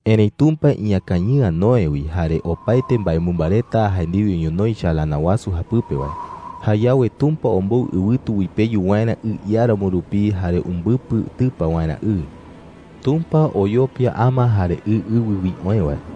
Erëi Tumpa iñakañɨ'ä Noé wi jare opaete mbaemɨmba reta jae ndiwe ñonoï chalana wasu japɨpe wae. Jayawe Tumpa ombou ɨwɨtu uipeyu waerä ɨ iáramo rupi jare umbɨpɨ tɨpa waerä ɨ. Tumpa oyopia ama jare ɨ ɨwɨ wi oë wae.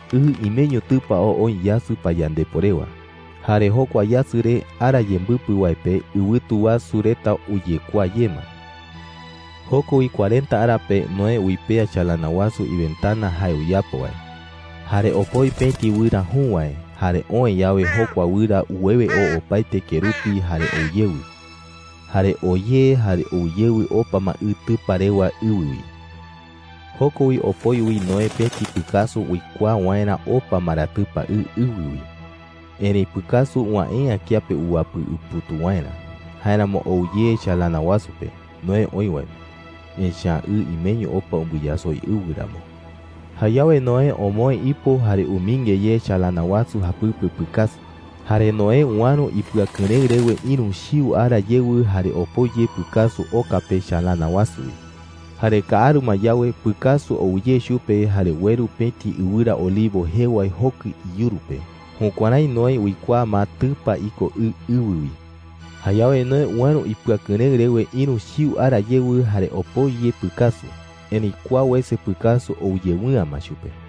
Ɨ imeño tɨpa oo oo yasɨ payandepo rewa. Jare jokua yasɨ re, ara yembɨpɨ wae pe, ɨwɨtu wasu reta uyekuaa ye ma. Joko wi cuarenta ara pe, Noé uipea chalana wasu iventana jae uyapo wae. Jare opoi pëti wɨra jü wae. Jare oë yawe, jokua wɨra uwewe oo opaete kerupi jare ou yewɨ. Jare oo ye jare ou yewɨ opa ma ɨ tɨpa rewa ɨwɨ wi. Joko wi opoi wi Noé pëti pɨkasu uikuaa waerä opa ma ra tɨpa ɨ ɨwɨ wi. Erëi pɨkasu uwäe’ä kiape uwapɨ uputuu waerä. Jáeramo ou ye chalana wasu pe, Noé oï wae pe, echa’ä ɨ imeño opa umbɨyasoi ɨwɨ ramo. Jayawe Noé omoë ipo jare umɨinge ye chalana wasu japɨpe pɨkasu. Jare Noé uäro ipɨakɨrëɨ rewe ïru chiu ara yewɨ jare opoi ye pɨkasu oka pe chalana wasu wi. Jare kaaru ma yawe, pɨkasu ou ye chupe jare ueru pëti ɨwɨra olivo jee wae jokɨ iyuru pe. Jukuärái Noé uikuaa ma tɨpa iko ɨ ɨwɨ wi. Jayawe Noé uäro ipɨakɨrëɨ rewe ïru chiu ara yewɨ jare opoi ye pɨkasu. Erëi kua wese pɨkasu ou yewɨ'ä ma chupe.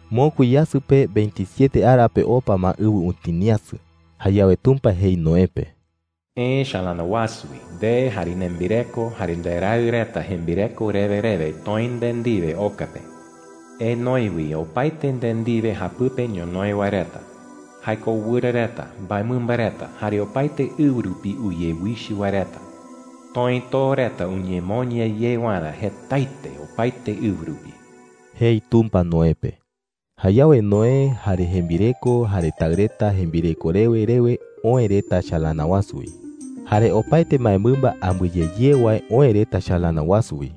Mokui yasɨ pe veintisiete ara pe opa ma ɨwɨ utiniasɨ. Jayawe Tumpa jei Noé pe: “Eë chalana wasu wi, nde jare nembireko, jare nderaɨ reta jembireko rewe rewe toë nde ndiwe oka pe,” jei. “Enoe wi opaete nde ndiwe japɨpe ñonoï wae reta – jae ko wɨra reta, mbaemɨmba reta, jare opaete ɨwɨ rupi uyewichɨ wae reta. Toë too reta uñemoña ye waerä jetaete opaete ɨwɨ rupi,” jei Tumpa Noé pe. Jayawe Noé, jare jembireko, jare taɨ reta jembireko rewe rewe oë reta chalana wasu wi. Jare opaete mbaemɨmba ambɨe ye ye wae oë reta chalana wasu wi.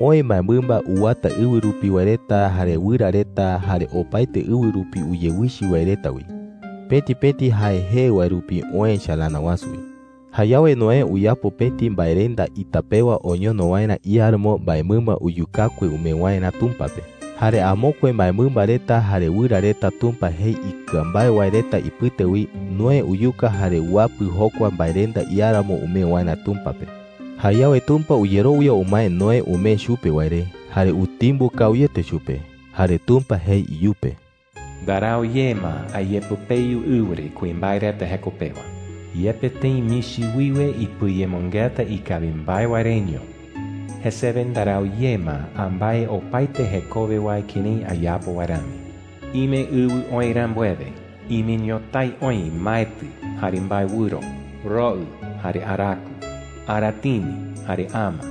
Oë mbaemɨmba uwata ɨwɨ rupi wae reta, jare wɨra reta, jare opaete ɨwɨ rupi uyewichɨ wae reta wi. Pëti pëti jae jee wae rupi oë chalana wasu wi. Jayawe Noé uyapo pëti mbaerenda ita pewa oñono waerä iáramo mbaemɨmba uyukakue umee waerä Tumpa pe. Jare amokue mbaemɨmba reta jare wɨra reta Tumpa jei ikɨa mbae wae reta ipɨte wi, Noé uyuka jare uapɨ jokua mbaerenda iáramo umee waerä Tumpa pe. Jayawe Tumpa uyerowia umae Noé umee chupe wae re, jare utimbo kawiete chupe. Jare Tumpa jei iyupe: “Ndarau ye ma ayepɨpeyu ɨwɨ re kuimbae reta jeko pewa,” jei. “Yepe tëi michi wiwe ipɨayemɨngeta ikawi mbae wae reño, jesewe ndarau ye ma ambái opaete jekowe wae kërái ayapo wae rami,” jei. “Ime ɨwɨ oï rambuewe, ime ñotái oï maetɨ jare mbaewɨro, roɨ jare araku, aratini jare ama,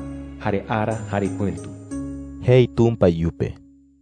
jare ara jare pɨ̈tu,” jei Tumpa iyupe.